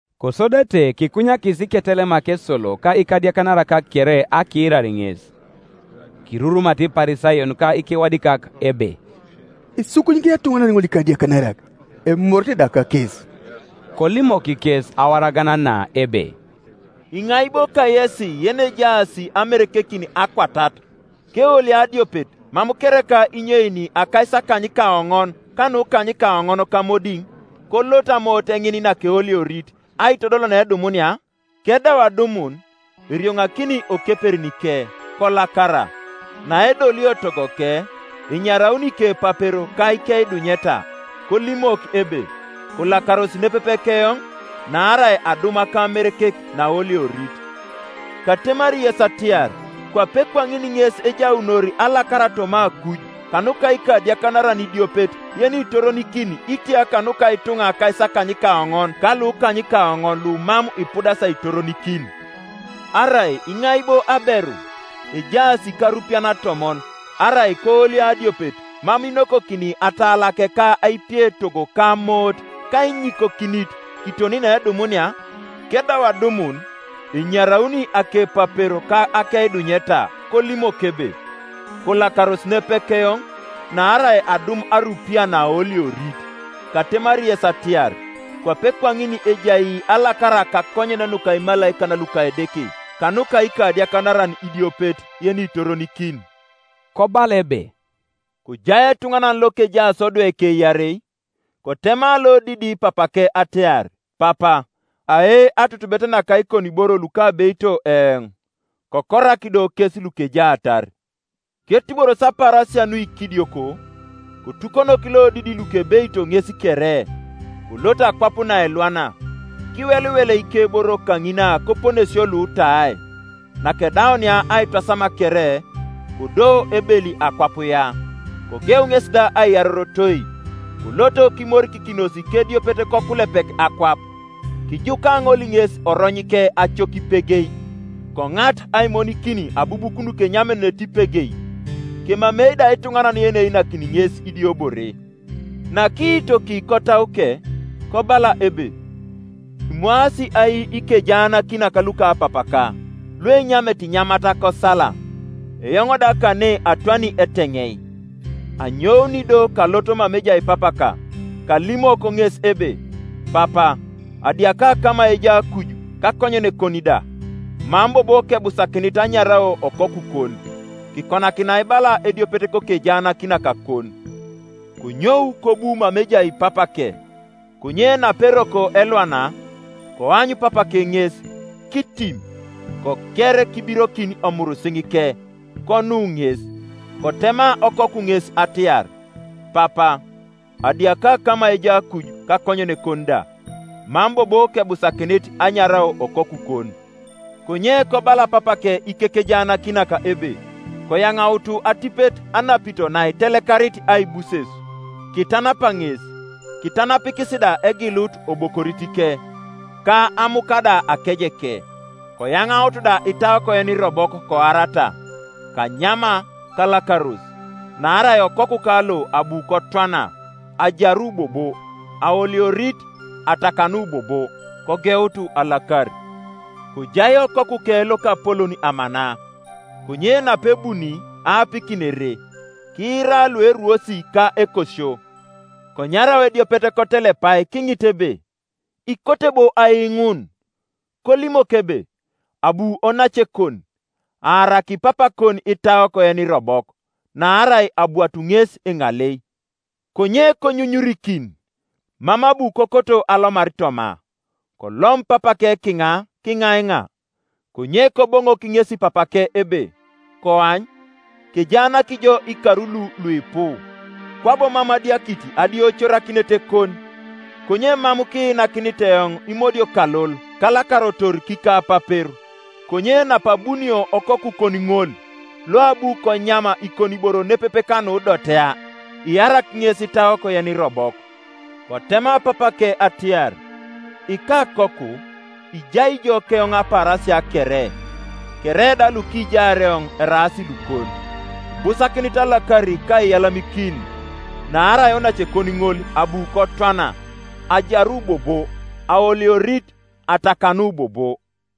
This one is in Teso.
Kosodete kikunyakis iketelemak esolo ka ikadiakanarak kere akiirar ŋes. Kirurumata Iparisayon ka ikewadikak ebe, “Isukunyikini etuŋanan ŋol ikadiakanarak, emorete da kakes.” Kolimok kes awaragan na ebe, “Iŋai bo kayes yenejaas amerekekin akwatat, keolio adiopet, mam kereka inyeini akaisakanykaoŋon ka nukanykaonon kamodiŋ, kolot amoot ŋin nakeoliorit aitodol needumunia? Kedau adumun, erioŋakini okeperinike, kolakara. Naedolio togoke, enyarauni ikepapero ka ikeidunyeta, kolimok ebe, ‘Kolakaros nepepe keoŋ, naarai adum akamerekek naaoliorit.’ Katemari yes atiar, Kwape kwaŋin ŋes ejaunor alakara toma akuj kanuka ikadiakanaran idiopet yenitoronikin itia kanuka ituŋa akaisakanykaoŋon ka lukanykaoŋon lumam ipudasi aitoronikin. “Arai iŋai bo aberu, ejaas karupiyan atomon, arai koolio adiopet, mam inokokini atalake ka aipie etogo ka amoot kainyikokinit kiton needumunia? Kedau adumun, enyarauni akepapero ka akeidunyeta kolimok ebe, ‘Kolakaros nepepe keoŋ, naarai adum arupiya naaoliorit.’ Katemari yes atiar, Kwape kwaŋin ejai alakara kakonyen nuka imalaikan luka Edeke kanuka ikadiakanaran idiopet yenitoronikin.” Kobala ebe, “Kojai etuŋanan lokejaas odweke iarei. Kotema lodidi papake atiar, ‘Papa, ae atutubet naka ikoniboro lukabeito eoŋ.’ Kokorak do kes lukejaatar. Ketuboros apaarasia nuikidioko, kotukonok lodidi lukebeito ŋes kere, kolot akwap naelwana, kiweliwel ikeboro kaŋina koponesio luutai. Nakedaunia aitwasam kere, kodo ebeli akwap ya, kogeu ŋesi da aiyarorotoi. Kolot kimorikikinos kediopet kokulepek akwap, kijuka ŋol ŋes oronyike acok ipegei. Koŋat aimonikin abubuk nukenyamete ipegei; kemamei da ituŋanan yeneinakini ŋes idiobore. Nakiitoki kotauke, kobala ebe, ‘Imwaasi ai ikejaanakinak luka papaka luenyamete inyamat kosala, eoŋ da kane atwani eteŋei. Anyouni do kalot mama ejai papaka, kalimok ŋes ebe, “Papa, adiaka kama ejai akuj, kakonyenekon da; Mam bobo kebusakinit anyarao okokukon; kikonakinai bala ediopet kokejaanakinakakon.” ’ Konyou kobu mama ejai papake. Konye naperoko elwana, koany papake ŋes, kitim, koker kibirokin omurisiŋike, konu ŋes. Kotema okoku ŋes atiar, ‘Papa, adiaka kama ejai akuj, kakonyenekon da; mam bobo kebusakinit anyarao okokukon.’ Konye kobala papake ikekejaanakinak ebe, ‘Koyaŋautu atipet anapito naitelekarit aibuses, kitanapa ŋes; kitanapikis da egilut obokoritike, ka amuka da akejeke; koyaŋautu da itaok yenirobok koarata, kanyama kalakaros; naarai okokuka lo abu kotwana, ajaru bobo; aoliorit, atakanu bobo.’ Kogeut alakar. “Kojai okokuke lokapolon amana; konye napebuni aapikin ere, kiira lueruos ka ekosio. Konyarau ediopet kotelepai kiŋit ebe, ‘Ikote bo ai ŋun?’ Kolimok ebe, ‘Abu onacekon, aaraki papakon itaok yenirobok, naarai abwatu ŋes eŋalei.’ Konye konyunyurikin, mam abu kokoto alomar toma. Kolom papake kiŋa kiŋaiŋa. Konye Koboŋok ŋesi papake ebe, ‘Koany, kejaanak jo ikar lu luipu, kwabo mam adiakit adioicorakinetekon; konye mam kiinakinit eoŋ imodiokalol, kalakarotor kikapapero. Konye napabunio okokukon ŋol, loabu konyam ikoniboro nepepe kanudotea, iarak ŋes itaok yenirobok.’ Kotema papake atiar, ‘Ikakoku, ijai ijo keoŋ apaarasia kere, kere da lukijaar eoŋ eraas lukon. Ibusakinit alakar ka aiyalamikin, naarai onacekon ŋol abu kotwana, ajaru bobo; aoliorit, atakanu bobo.’”